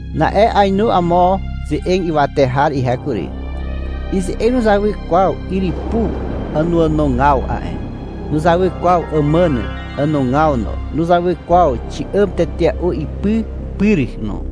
Na'e ainu amo ze'eg ywate har ihe kury. Ize'eg nuzawy kwaw yrypu ànoànogaw a'e. Nuzawy kwaw àmàn ànogaw no. Nuzawy kwaw xi'àm tetea'u ipy pyr no.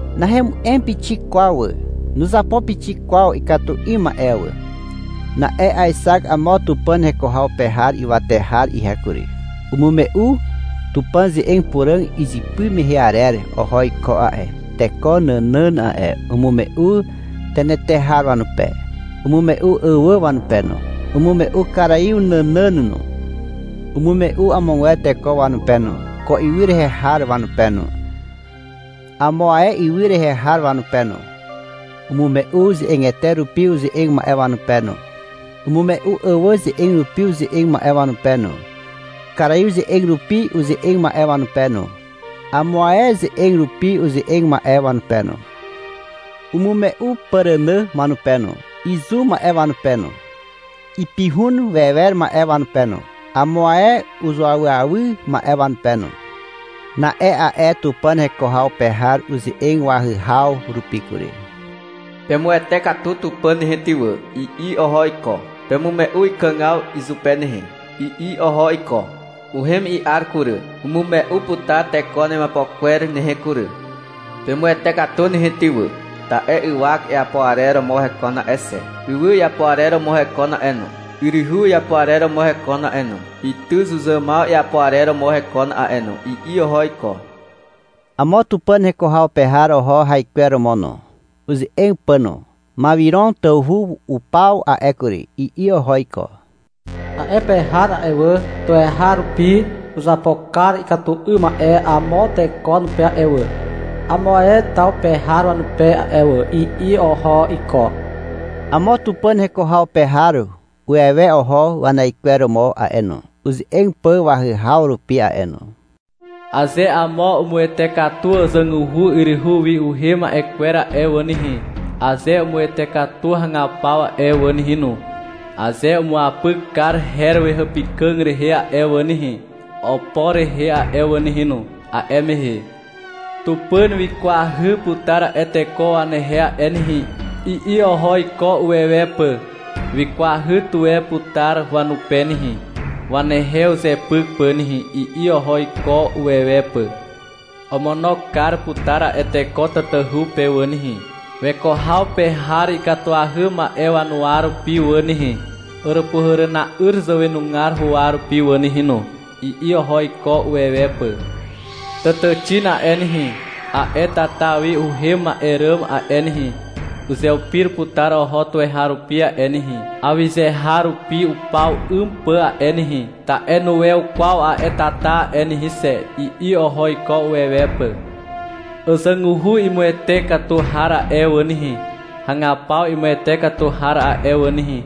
Nahemu'em pixik kwaw wà. Nuzapo pixik kwaw ikatu 'ym ma'e wà. Na'e aexak amo Tupàn heko haw pe har ywate har ihe kury. Umume'u Tupàn ze'eg puràg izypy mehe arer oho iko a'e, teko nànàn a'e. Umume'u tenetehar wanupe. Umume'u àwà wanupe no. Umume'u karaiw nànàn no. Umume'u amogwer teko wanupe no, ko ywy rehe har wanupe no, amo ae ywy rehe har wanupe no. Umume'u ze'egete rupi uze'eg ma'e wanupe no. Umume'u àwà ze'eg rupi uze'eg ma'e wanupe no, karaiw ze'eg rupi uze'eg ma'e wanupe no, amo ae ze'eg rupi uze'eg ma'e wanupe no. Umume'u pàrànà wanupe no, izu ma'e wanupe no, ipihun wewer ma'e wanupe no, amo ae uzuawyawy ma'e wanupe no. Na'e a'e Tupàn heko haw pe har uze'eg wahyhaw rupi kury. — Pemuwete katu Tupàn nehe ty wà, i'i oho iko. — Pemume'u ikàgaw izupe nehe, i'i oho iko. — Uhem i'ar kury. Umume'u putar teko wanemiapo kwer nehe kury. Pemuwete katu nehe ty wà, ta'e ywak iapo arer romo hekon a'e xe. Ywy iapo arer romo hekon a'e no. Yryhu iapo arer romo hekon a'e no. Ytyzuzàmaw iapo arer romo hekon a'e no, i'i oho iko. Amo Tupàn heko haw pe har oho haikweromo no, uze'eg pà no. — Mawiron tawhu upaw a'e kury, i'i oho iko. — A'e pe har a'e wà, tuweharupi uzapo kar ikatu 'ym ma'e amo teko wanupe a'e wà, amo ae taw pe har wanupe a'e wà, i'i oho iko. Amo Tupàn heko haw pe har uwewe oho wanaikweromo a'e no, uze'eg pà wahyhaw rupi a'e no. — Aze amo umuwete katu àzàguhu yryhu wi uhem ma'e kwer a'e wà nehe, aze umuwete katu hagapaw a'e wà nehe no, aze umuapyk kar her wehàpykà rehe a'e wà nehe, opo rehe a'e wà nehe no, a'e mehe Tupàn wikwahy putar a'e teko wanehe a'e nehe, i'i oho iko uwewe pà. — Wikwahy tuwe putar wanupe nehe, wanehe uzepyk pà nehe, i'i oho iko uwewe pà. — Omono kar putar a'e teko tatahu pe wà nehe, weko haw pe har ikatuahy ma'e wanuwa rupi wà nehe, Àràpuhàràna'yr zàwenugar huwa rupi wà nehe no, i'i oho iko uwewe pà. — Tàtàxin a'e nehe, a'e tata wi uhem ma'e ràm a'e nehe, uzeupir putar oho tuweharupi a'e nehe, awyze har rupi upaw 'ym pà a'e nehe, ta'e nuwew kwaw a'e tata a'e nehe xe, i'i oho iko uwewe pà. — Àzàguhu imuwete katu har a'e wà nehe, hagapaw imuwete katu har a'e wà nehe,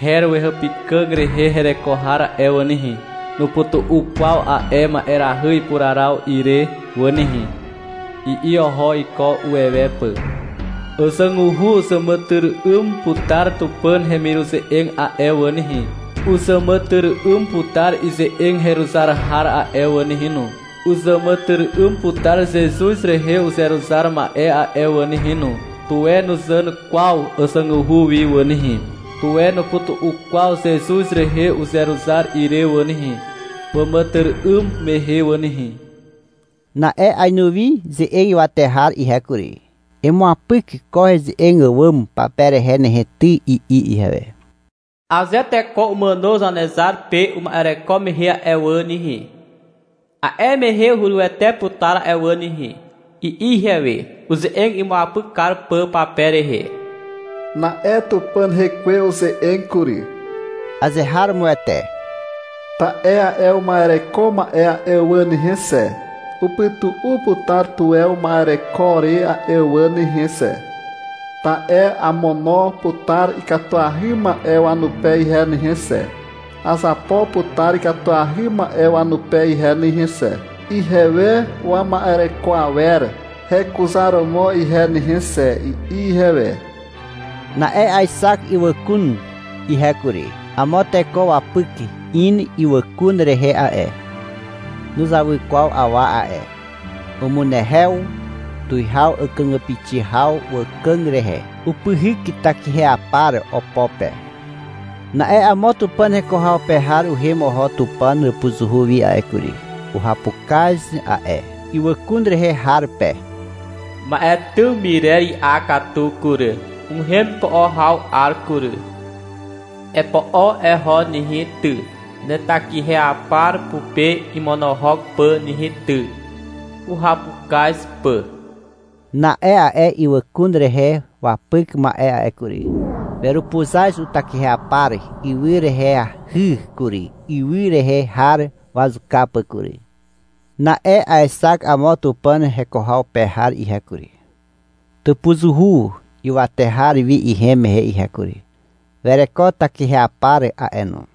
her wehàpykà rehe hereko har a'e wà nehe, nupytu'u kwaw a'e ma'erahy ipuraraw ire wà nehe, i'i oho iko uwewe pà. Àzàguhu uzàmàtyry'ym putar Tupàn hemiruze'eg a'e wà nehe. Uzàmàtyry'ym putar ize'eg heruzar har a'e wà nehe no. Uzàmàtyry'ym putar Zezuz rehe uzeruzar ma'e a'e wà nehe no. Tuwe nuzàn kwaw àzàguhu wi wà nehe, tuwe nupytu'u kwaw Zezuz rehe uzeruzar ire wà nehe, wàmàtyry'ym mehe wà nehe. Na'e ainu wi ze'eg ywate har ihe kury. — Emuapyk ko heze'eg àwàm pape rehe nehe ty, i'i ihewe. — Aze teko umàno Zanezar pe uma'ereko mehe a'e wà nehe, a'e mehe hurywete putar a'e wà nehe, i'i ihewe, uze'eg imuapyk kar pà pape rehe. Na'e Tupàn Hekwe uze'eg kury. — Azeharomoete. Ta'e a'e uma'ereko ma'e a'e wà nehe xe, upytu'u putar tuwe uma'ereko re a'e wà nehe xe. Ta'e amono putar ikatuahy ma'e wanupe ihe nehe xe, azapo putar ikatuahy ma'e wanupe ihe nehe xe, ihewe wama'ereko awer hekuzaromo ihe nehe xe, i'i ihewe. Na'e aexak ywàkun ihe kury. Amo teko wapyk in ywàkun rehe a'e. Nuzawy kwaw awa a'e. Umunehew tuwihaw àkàgàpixi haw wàkàg rehe. Upyhyk takiheapar opo pe. Na'e amo Tupàn heko haw pe har uhem oho Tupàn hàpuzuhu wi a'e kury. Uhapukaz a'e ywàkun rehe har pe. — Ma'e tym myrer i'a katu kury, uhem ipo'o haw 'ar kury, i'i izupe. — Epo'o eho nehe ty, netakiheapar pupe imonohok pà nehe ty, i'i izupe, uhapukaz pà. Na'e a'e ywàkun rehe wapyk ma'e a'e kury, werupuzaz utakiheapar ywy reheahy kury, ywy rehe har wazuka pà kury. Na'e aexak amo Tupàn heko haw pe har ihe kury, tàpuzuhu ywate har wi ihem mehe ihe kury. Wereko takiheapar a'e no.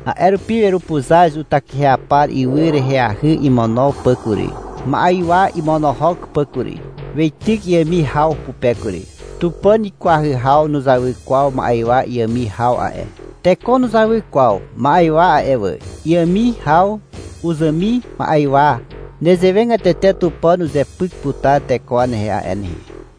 A'e rupi werupuzaz utakiheapar ywy reheahy imono pà kury, ma'ywa imonohok pà kury. Weityk iàmi haw pupe kury. Tupàn ikwahy haw nuzawy kwaw ma'ywa iàmi haw a'e. Teko nuzawy kwaw ma'ywa a'e wà. Iàmi haw uzàmi ma'ywa. Nezewegatete Tupàn uzepyk putar teko wanehe a'e nehe.